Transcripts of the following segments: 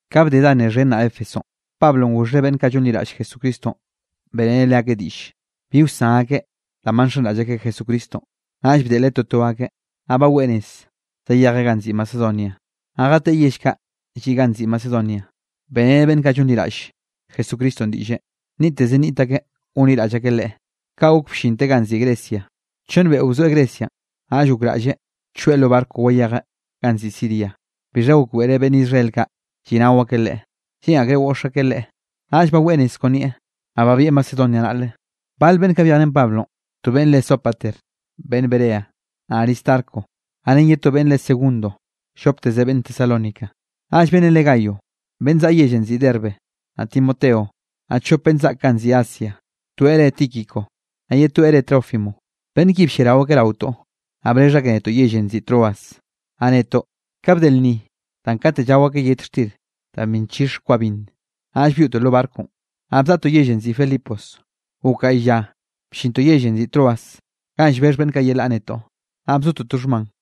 Ka bde da nne xhen naꞌ Éfesonꞌ, Pablonꞌ goxheꞌ beꞌnn kaꞌ llonliraꞌll Jesucristonꞌ, beꞌreneꞌ leakeꞌ diꞌll bi wsan akeꞌ danꞌ ba nxenraꞌll akeꞌ Jesucristonꞌ. Naꞌll bdeꞌleꞌ toto akeꞌ, naꞌ baweꞌ nez zayejeꞌ ganꞌ nziꞌi Macedonia. Naꞌ jateꞌe yell kaꞌ lliꞌ ganꞌ nziꞌi Macedonia, beꞌreneꞌ beꞌnn kaꞌ llonliraꞌll Jesucristonꞌ diꞌlle, nniꞌtteze nniꞌt akeꞌ gonliraꞌll akeꞌ Leꞌe. Kaꞌ gok bllinteꞌ ganꞌ nziꞌi Grecia. Chonn beꞌo bzoeꞌ Grecianꞌ. Naꞌll gokraꞌlleꞌ choeꞌ lo barco wayejeꞌ ganꞌ nziꞌi Siria, bixha gokbeꞌreꞌ beꞌnn Israel kaꞌ lliꞌnao akeꞌ leꞌe, lleꞌn akreꞌ goꞌx akeꞌ leꞌe. Naꞌll baweꞌ nez kon nieꞌ, naꞌ babieꞌ Macedonia naꞌle. Bal beꞌnn kaꞌ byejrén akeꞌ Pablonꞌ, to beꞌnn re Sópater beꞌnn Berea, naꞌ Aristarco, naꞌ ren ye to beꞌnn re Segundo llopteze beꞌnn Tesalónica, naꞌll beꞌnnenꞌ re Gayo, beꞌnn zaꞌa yellenꞌ nziꞌi Derbe, naꞌ Timoteo, naꞌ chop beꞌnn zaꞌk ganꞌ nziꞌi Asia, toeꞌ reꞌe Tíquico, naꞌ ye toeꞌ reꞌe Trófimo. Beꞌnn ki blliarao akeꞌ raotoꞌ, naꞌ brexh akeꞌ netoꞌ yellenꞌ nziꞌi Troas. Naꞌ netoꞌ, ka bde lnni danꞌ kate llao akeꞌ yet xtir danꞌ bi nchixe kwa binn, naꞌll byoꞌtoꞌ lo barconꞌ, naꞌ bzaꞌtoꞌ yellenꞌ nziꞌi Filipos. Gok gaꞌy lla bllintoꞌ yellenꞌ nziꞌi Troas ganꞌ llbexh beꞌnn kaꞌ yelaꞌ netoꞌ, naꞌ bzotoꞌ to xhman.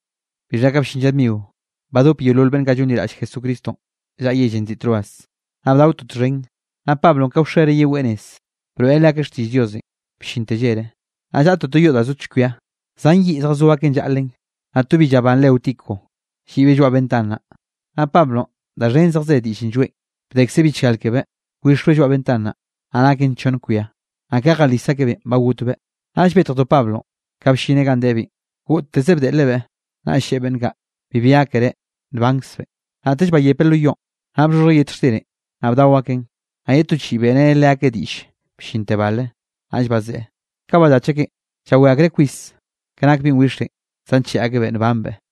Bixha ka bllin lla dmio, badop yeolol beꞌnn kaꞌ llonliraꞌll Jesucristonꞌ llaꞌa yellenꞌ nziꞌi Troas, naꞌ bdaotoꞌ txhen. Naꞌ Pablonꞌ ka wxere yeweꞌ nez, broeꞌreꞌ leakeꞌ xtiꞌll Diosenꞌ bllinte llere. Naꞌ llaꞌtoꞌ to yoꞌ da zo chkwia, zan yiꞌn zjazó akeꞌn llaꞌlen. Naꞌ to bi llabán re Eutico, lliꞌbeꞌ lloaꞌ ventan naꞌ, naꞌ Pablonꞌ da xhen zejze diꞌllenꞌ lloeꞌn, bdekze bichgal kebeꞌ, wixbeꞌ lloaꞌ ventan naꞌ, naꞌ naken chonn kwia, naꞌ ka jalis akebeꞌn, ba gotbeꞌ. Naꞌll betjdo Pablonꞌ, ka bllineꞌ ganꞌ debeꞌn, goꞌtteze bdeꞌlebeꞌ, naꞌll lleꞌe beꞌnn kaꞌ: —Bibi gákere, nbankzbeꞌn. Naꞌtell bayepeꞌ lo yoꞌn, naꞌ bxhoxhjeꞌ yet xtirenꞌ, naꞌ bdao akeꞌn, naꞌ ye to chiꞌi beꞌreneꞌ leakeꞌ diꞌll bllinte bale, naꞌll bazeꞌe. Ka ballach akeꞌn, llawé akreꞌ kwis ka nak binꞌ wixenꞌ, zancheꞌe akebeꞌ nbanbeꞌ.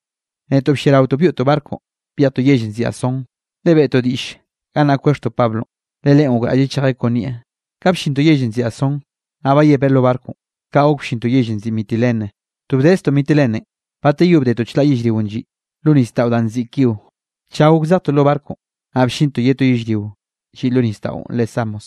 Netoꞌ blliaraotoꞌ byoꞌtoꞌ barco byejtoꞌ yellenꞌ nziꞌi Asón, le beꞌtoꞌ diꞌll gannaꞌ kwexhtoꞌ Pablonꞌ, le leꞌen gokraꞌlleꞌ chejeꞌ kon nieꞌ. Kaꞌ bllintoꞌ yellenꞌ nziꞌi Asón, naꞌ byepeꞌ lo barconꞌ, kaꞌ gok bllintoꞌ yellenꞌ nziꞌi Mitilene. To bdeztoꞌ Mitilenenꞌ, bateyó bdetoꞌ chlaꞌ yellrionꞌ lliꞌ lo nisdaꞌon danꞌ nziꞌi Quío. Tlla gok zejtoꞌ lo barconꞌ, naꞌ bllintoꞌ ye to yellrionꞌ lliꞌ lo nisdaꞌon re Samos.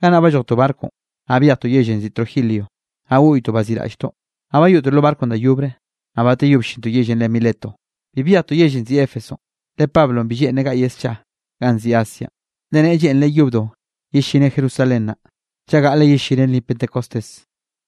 Gannaꞌ ballojtoꞌ barconꞌ, naꞌ byejtoꞌ yellenꞌ nziꞌi Trogilio, naꞌ goꞌytoꞌ baziꞌraꞌlltoꞌ. Naꞌ bayoꞌtoꞌ lo barco da yobre, naꞌ bateyó bllintoꞌ yellenꞌ re Mileto. Bi byejtoꞌ yellenꞌ nziꞌi Éfesonꞌ, le Pablonꞌ bi lleꞌnreꞌ gaꞌyeꞌ scha ganꞌ nziꞌi Asianꞌ, le ne lleꞌnreꞌ yobdo yellineꞌ Jerusalén naꞌ, chaꞌ gaꞌle yellineꞌ lnni Pentecostés.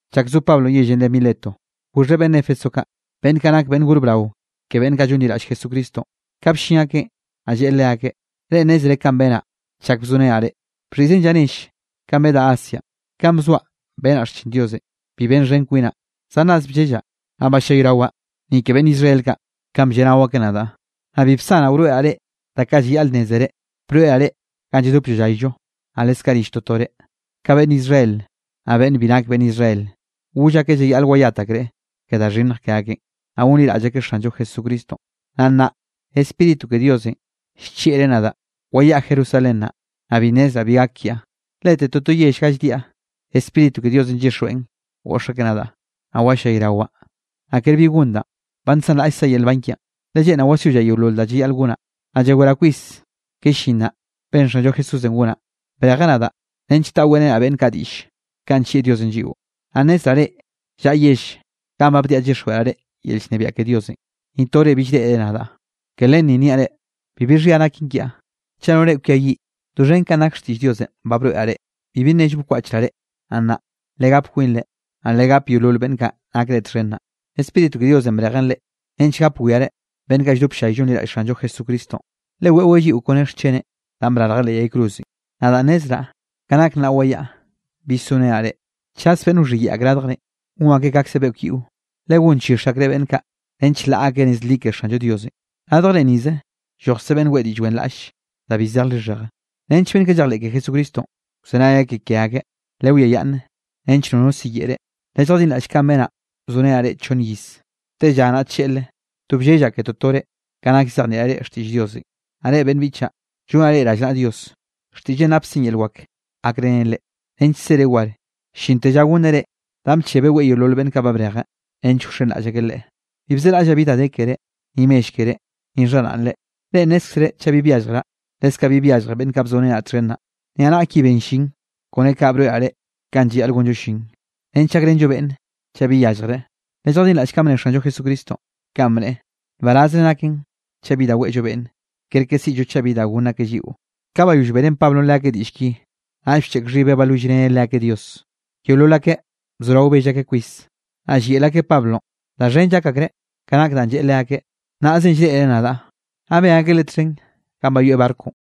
Chak zo Pablonꞌ yellenꞌ re Mileto, goxheꞌ beꞌnn Éfeso kaꞌ, beꞌnn kaꞌ nak beꞌnn gor brao ke beꞌnn kaꞌ llonliraꞌll Jesucristonꞌ. Ka bllin akeꞌn, naꞌ lleꞌe leakeꞌ: —Reꞌ nnézere kanꞌ benaꞌ chak bzorenaꞌ reꞌ, bxhiꞌzen lla nell kanꞌ bedaꞌ Asianꞌ. Kanꞌ bzoaꞌ, benaꞌ xchin Diosenꞌ, bi benxhen kwinaꞌ, zan ras bllellaꞌ, naꞌ ballayrawaꞌ ni ke beꞌnn Israel kaꞌ, kanꞌ blleꞌnao akeꞌ nadaꞌ. Naꞌ bi bsanaꞌ wroeꞌraꞌ reꞌ da kaꞌ llayaꞌl nnézeren, broeꞌraꞌ reꞌ ganꞌ lladop llallayllo, naꞌ leskaꞌ rill totore. Ka beꞌnn Israel, naꞌ beꞌnn bi nak beꞌnn Israel, goll akeꞌ llayaꞌl wayat akreꞌ ke da xhinnj ke akeꞌn, naꞌ gonliraꞌll akeꞌ Xanllo Jesucristonꞌ. Naꞌ nnaꞌ, Spíritu ke Diosenꞌ llchieꞌreꞌ nadaꞌ wayaꞌa Jerusalén naꞌ, naꞌ bi nnezraꞌ bi gak kiaꞌ. Lete toto yell ga lldiaꞌ, Spíritu ke Diosenꞌ llyixjweꞌn goꞌx akeꞌ nadaꞌ, naꞌ wallayrawaꞌ. Naꞌ ker bi gon danꞌ, ba nsanraꞌllkzaꞌ yel nban kiaꞌn, le lleꞌnraꞌ wasyollaꞌ yeolol da llayaꞌl gonaꞌ. Naꞌ llaweraꞌ kwis ke llin naꞌ, benn Xanllo Jesúsenꞌ gonaꞌ. Brejeꞌ nadaꞌ nench taꞌa weꞌrenaꞌ beꞌnn kaꞌ diꞌll kanꞌ nllieꞌ Diosenꞌ lliꞌo. ’Naꞌ nnezraꞌ reꞌ llaꞌa yell ganꞌ ba bdiaꞌ llyixjweꞌraꞌ yel llnebiaꞌ ke Diosenꞌ, ni tore bill reꞌre nadaꞌ. Ke len ni niaꞌ reꞌ, bibi xhia naken kiaꞌ, chaꞌ no reꞌ kwiayiꞌ. Doxhen kanꞌ nak xtiꞌll Diosenꞌ ba broeꞌraꞌ reꞌ, bibi nello bkwaꞌchraꞌ reꞌ. Naꞌ nnaꞌ, legap kwinre, naꞌ legap yeolol beꞌnn kaꞌ nakre txhen naꞌ. Spíritu ke Diosenꞌ brejen reꞌ, nench gap wiare beꞌnn kaꞌ lldop ll-llay llonliraꞌll Xanllo Jesucristonꞌ, le weꞌweꞌ lliꞌo kon ren xcheneꞌ danꞌ brarje leꞌ yay cruzenꞌ. Nadaꞌ nnezraꞌ, ka nak nnaꞌ wayaꞌa bill sorenaꞌ reꞌ. Chaz beꞌnn wxhiyeꞌe ak radjrenꞌ, gon akeꞌ kaꞌkze beꞌkw yiꞌo, le gonchix akreꞌ beꞌnn kaꞌ nench laꞌa akeꞌ nez li ke Xanllo Diosenꞌ. Radjre nize llojkze beꞌnn weꞌe diꞌll wenraꞌll da bi zej lixheje, nench beꞌnn kaꞌ llejleꞌ ke Jesucristonꞌ, wzenay akeꞌ ke akeꞌ. Lewiayaꞌnn nench nono siyeꞌe reꞌ, lelljadinraꞌll kanꞌ benaꞌ bzorenaꞌ reꞌ chonn iz, tella naꞌ tlleꞌle, to bllellaꞌ ke totore ka nak llzejnieꞌraꞌ reꞌ xtiꞌll Diosenꞌ. ’Naꞌ reꞌ beꞌnn biꞌchaꞌ, llonaꞌ reꞌ rallnaꞌa Dios, xtiꞌlleꞌn napkzen yel wak gakrenen reꞌ, nench sere war llinte lla gonneꞌ reꞌ danꞌ bchebeꞌ weꞌe yeolol beꞌnn kaꞌ brejeꞌ, nench wxenraꞌll akeꞌ leꞌe. Bi bzeraꞌllaꞌ bi da de keré, ni mell keré, ni xharaꞌnre. Reꞌ nnézkzere chaꞌ bi byalljraꞌ, leskaꞌ bi byalljre beꞌnn kaꞌ bzorenaꞌ txhen naꞌ, niaꞌnaꞌ ki ben llin. Kone kaꞌ broeꞌraꞌ reꞌ kanꞌ llayaꞌl gonllo llin, nench gakrenllo beꞌnn chaꞌ bi yalljreꞌ. Lelljadinraꞌll kanꞌ bne Xanllo Jesucristonꞌ, kanꞌ bneꞌe: “Nbarazre naken chaꞌ bi weꞌllo beꞌnn, kerke siꞌllo chaꞌ bi da gonn akeꞌ lliꞌo.” Ka bayoll beꞌrén Pablonꞌ leakeꞌ diꞌll ki, naꞌll bcheꞌk xhibeꞌ balwillreneꞌ leakeꞌ Dios. Yeolol akeꞌ bzorao bell akeꞌ kwis, naꞌ llyeꞌl akeꞌ Pablonꞌ. Da xhen llak akreꞌ ka nak danꞌ lleꞌe leakeꞌ: “Nnaꞌze llreꞌre nadaꞌ.” Naꞌ ben akeꞌ leꞌe txhen ganꞌ bayoeꞌ barconꞌ.